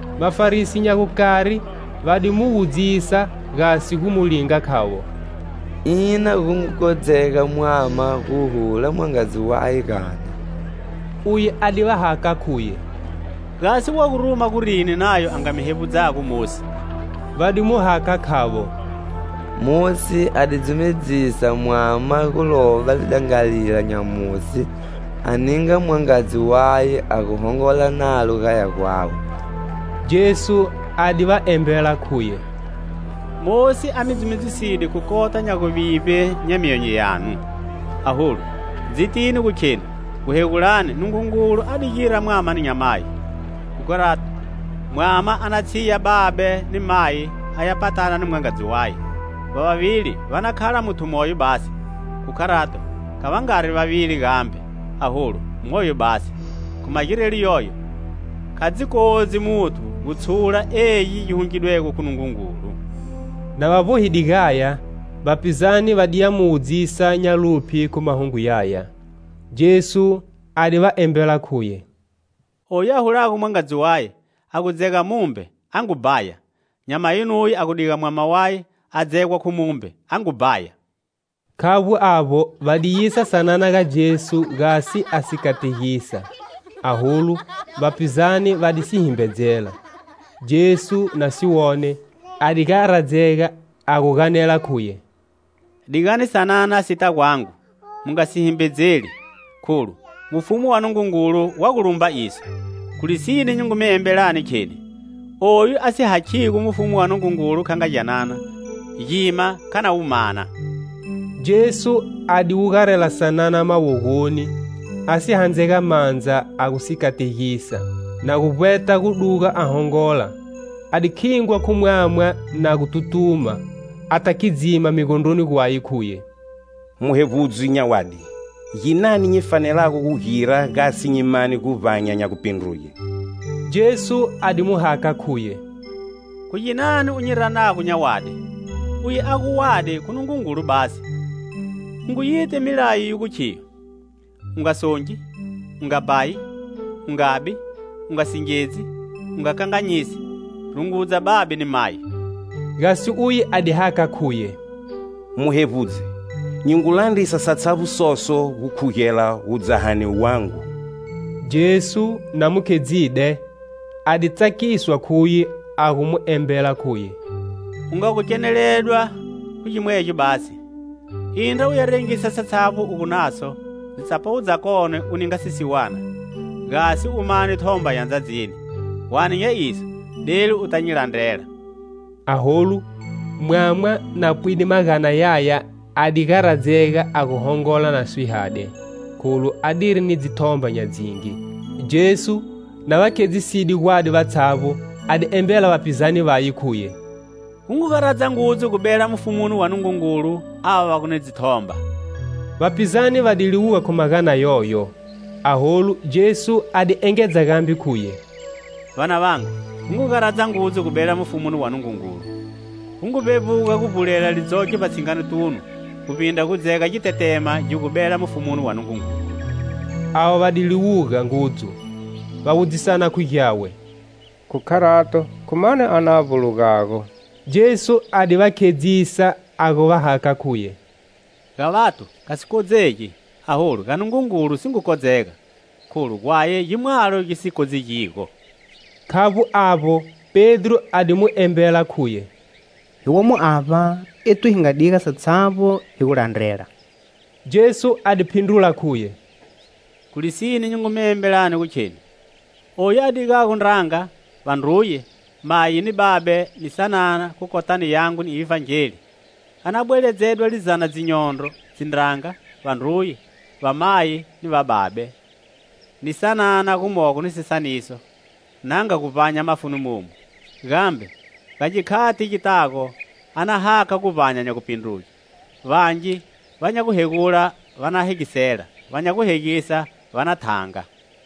Vafarisi nya gukari va di mu wudzisa gasi gu mu linga khavo: "Ina gu ngu kodzega mwama gu hula mwangadzi waye gani?" Uye a di va hakha khuye: "Gasi wa gu ruma gurini Nayo a nga mi hevbudzago Mosi?" Va di mu hakha khavo: "Mosi a di dzumedzisa mwama gu lova lidangalila nya musi a ninga mwangadzi waye a gu hongola nalo gaya gwawe." Jesu a di va embela khuye: "Mosi a mi dzumedziside khu kota nya guvivbe nya myonyo yanu. Aholu, dzitini gu khenu guhegulani Nungungulu a di gira mwama ni nyamayi. Khu kharato, mwama a na tshiya babe ni mayi a ya patana ni mwangadzi waye. Va vavili va na khala muthu moyo basi. Khu kharato, kha va ngari vavili gambe, aholu moyo basi. Khu magirelo yoyo, kha dzi kodzi muthu gu tshula egi gi hungidwego khu Nungungulu." Na va vbohide gaya, vapizane va di ya mu wudzisa nya luphye khu mahungu yaya. Jesu a di va embela khuye: "Oyu a hulago mwangadzi waye a gu dzega mumbe a ngu bhaya. Nyamayi nuye a gu diga mwama waye a dzegwa khu mumbe a ngu bhaya." Khavbo avbo, va di yisa sanana ga Jesu gasi a si kategisa. Aholu, vapizane va di si himbedzela. Jesu, na si wone, a di garadzega a gu ganela khuye: "Digani sanana sita gwangu. Mu nga si himbedzeli, kholu mufumu wa Nungungulu wa gu lumba iso. Khu lisine nyi ngu mi embelani kheni oyu a si hakhigo mufumu wa Nungungulu kha nga gyanana, gima kha na wu mana." Jesu a di wugarela sanana mawogoni, a si handzega mandza a gu si kategisa. Na gu vbweta gu duga a hongola, a di khingwa khu mwama na gu tutuma, a ta khidzima migondroni gwaye khuye: "Muhevbudzi nya wadi, ginani nyi fanelago gu gira gasi nyi mane guvbanya nya gupindruge?" Jesu a di mu hakha khuye: "Khu ginani u nyi ranago nya wadi? Uye a gu wadi, khu Nungungulu basi. U ngu yiti milayo yi gu khiyo: 'U nga songi; u nga bhayi; u ngabi; u nga singedzi; u nga kanganyisi; rungudza babe ni mayi.' " Gasi uye a di hakha khuye: "Muhevbudzi, nyi ngu landrisa satshavbo soso gu khugela wudzahani wangu." Jesu, na mu khedzide, a di tsakiswa khuye a gu mu embela khuye: "U nga gu keneledwa khu gimwegyo basi. Indra u ya rengisa satshavbo u gu naso, dzitsapawu dzakone u ninga sisiwana, gasi u mane thomba ya ndzadzini. Hwane nya iso delu uta nyi landrela." Aholu, mwama, na pwide magana yaya a di garadzega a gu hongola na swihade kholu adiri ni dzithomba nya dzingi. Jesu, na va khedziside gwadi vatshavbo, a di embela vapizane vaye khuye: "Gu ngu garadza ngudzu gubela mufumuni wa Nungungulu ava va gu ni dzithomba!" Vapizane va di liwuga khu magana yoyo. Aholu Jesu a di engedza gambe khuye: "Vanavangu, gu ngu garadza ngudzu gubela mufumuni wa Nungungulu! Gu ngu vbevbuga gu vbulela lidzoke vbatshinganotunu guvbindra gu dzega gitetema gi gu bela mufumuni wa Nungungulu." Avo va di liwuga ngudzu. Va wudzisana khu gyawe: "Khu kharato khu mani a na vbulugago?" Jesu a di va khedzisa a gu va hakha khuye: "Ga vathu kha si kodzegi, aholu ga Nungungulu si ngu kodzega, kholu, gwaye gimwalo gi si kodzegigo." Khavbo avbo, Pedro a di mu embela khuye: "Hi womo avba ethu hi nga diga satshavbo hi gu landrela." Jesu a di phindrula khuye: "Khu lisine nyi ngu mi embelani gu kheni: oyu a digago ndranga, vandruye, mayi ni babe ni sanana khu kotani yangu ni Ivhangeli, a na bweledzedwa lizana dzinyondro dzindranga, vandruye, vamayi ni vababe, ni sanana gumogo ni sisaniso, na nga guvbanya mafuni momu, gambe ga gikhati gitago a na hakha guvbanya nya gupindruge. Vangi va nya guhegula va na hegisela, va nya guhegisa va na thanga."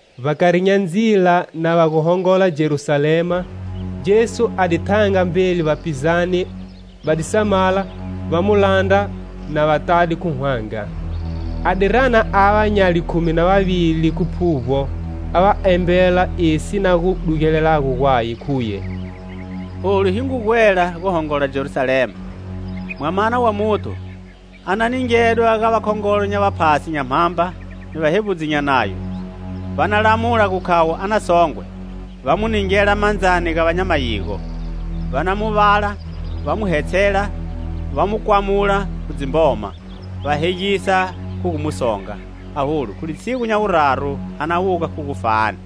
Vbakari nya ndzila, na va gu hongola Jerusalema, Jesu a di thanga mbeli vapizane va di samala, va mu landra na va tade khu hwanga. A di rana ava nya likhumi na vavili khu phuvbo, a va embela esi si na gu dugelelago gwaye, khuye: "Olu hi ngu gwela, gu hongola Jerusalema, Mwamana wa Muthu a na ningedwa ga vakhongolo nya vaphasi nya mhamba, ni vahevbudzi nya Nayo, va na lamula gu khavo a na songwe, va mu ningela mandzani ga va nya mayigo, va na mu vala, va mu hetshela, va mu kwamula khu dzimboma, va hegisa khu gu mu songa. Aholu, khu litshigu nya wuraru a na wuga khu gufani."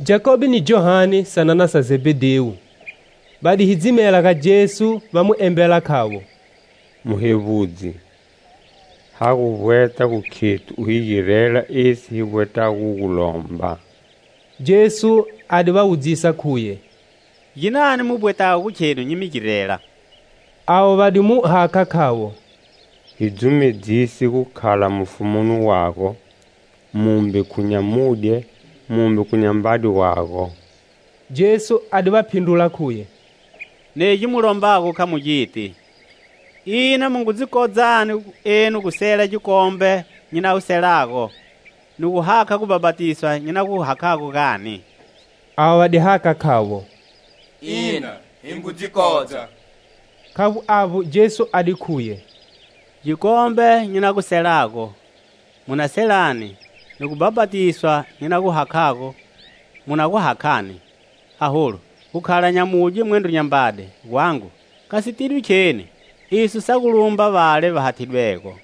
Jakobe ni Johane, sanana sa Zebhedhewu, va di hidzimela ga Jesu va mu embela khavo: "Muhevbudzi, ha gu vbweta gu khethu u hi girela esi hi vbwetago gu gulomba." Jesu a di va wudzisa khuye: "Ginani mu vbwetago khenu nyi mi girela?" Avo va di mu hakha khavo: "Hi dzumedzise gukhala mufumoni wago, mumbe khu nyamudye, mumbe khu nyambade wago." Jesu a di va phindrula khuye: "Negi mu lombago kha mu giti! Ina mu ngu dzi kodzani enu gu sela gikombe nyi na gu selago, ni gu hakha gubhapatisa nyi na gu hakhago, gani?" Avo va di hakha khavo: "Ina, hi ngu dzi kodza." Khavbo avbo, Jesu a di khuye: "Gikombe nyi na gu selago, mu na selani, ni gubhapatisa nyi na gu hakhago mu na gu hakhani. Aholu, gukhala nyamudye mwendro nyambade gwangu kha si tidwi kheni; iso sa gu lumba vale va hathidwego."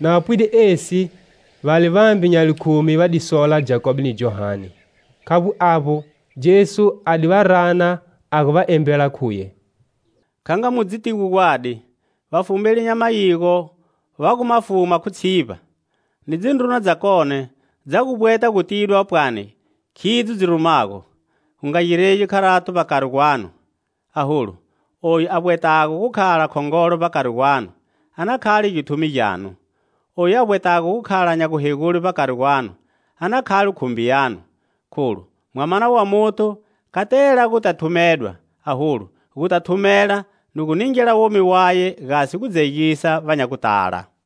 Na va pwide esi, vale vambe nya likhumi va di sola Jakobe ni Johane. Khavbo avbo, Jesu a di va rana a gu va embela khuye: "Kha nga mu dzitigo gwadi, vafumeli nya mayigo va gu ma fuma khu tshivba, ni dzindruna dzakone dza gu vbweta gu tidwa pwani khidzo dzi rumago. Gu nga giregi kharato vbakari gwanu. Aholu, oyu a vbwetago gu khala khongolo vbakari gwanu, a na khale githumi gyanu; oyu a vbwetago gu khala nya guhegule vbakari gwanu, a na khale khumbi yanu. Kholu, Mwamana wa Muthu kha tela guta thumedwa aholu, guta thumela ni gu ningela womi waye gasi gudzegisa va nya gutala."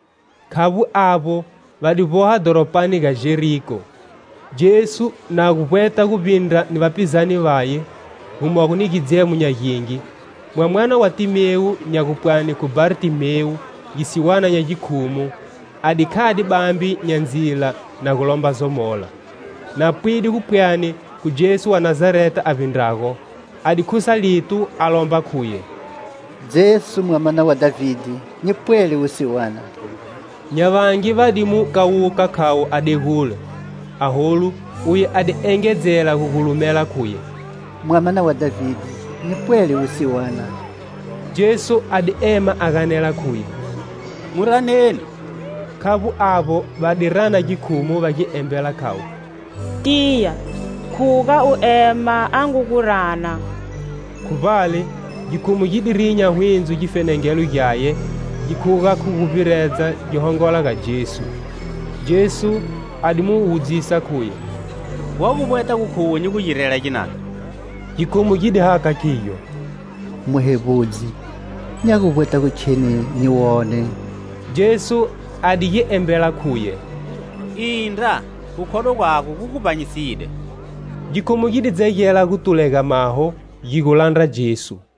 Khavbo avbo, va di vboha dhoropani ga Jeriko. Jesu, na gu vbweta gu vbindra ni vapizane vaye, gumogo ni gidzemo nya gingi, mwamana wa Timewu nya gupwani khu Bartimewu, gisiwana nya gikhumu, a di khade bambe nya ndzila na gu lomba zomola. Na pwide gu pwani khu Jesu wa Nazareta a vbindrago, a di khusa lito a lomba khuye: "Jesu, mwamana wa Dhavide, nyi pwele wusiwana." Nya vangi va di mu kawuka khavo a degule. Aholu, uye a di engedzela gu gulumela khuye: "Mwamana wa Dhavide, nyi pwele wusiwana!" Jesu a di ema a ganela khuye: "Mu raneni." Khavbo avbo, va di rana gikhumu va gi embela khavo: "Tiya, khuga u ema, a ngu gu rana." Khu vbale, gikhumu gi di rinya hwindzo gifenengelo gyaye gi khuga khu guvbiredza gi hongola ga Jesu. Jesu a di mu wudzisa khuye: "Wa gu vbweta gu khuwe nyi gu girela ginani?" Gikhumu gi di hakha khigyo: "Muhevbudzi, nya gu vbweta gu kheni nyi wone!" Jesu a di gi embela khuye: "Indra, gukhodwa gwago gu gu vbanyisile." Gikhumu gi di dzegela gu tulega maho gi gu landra Jesu.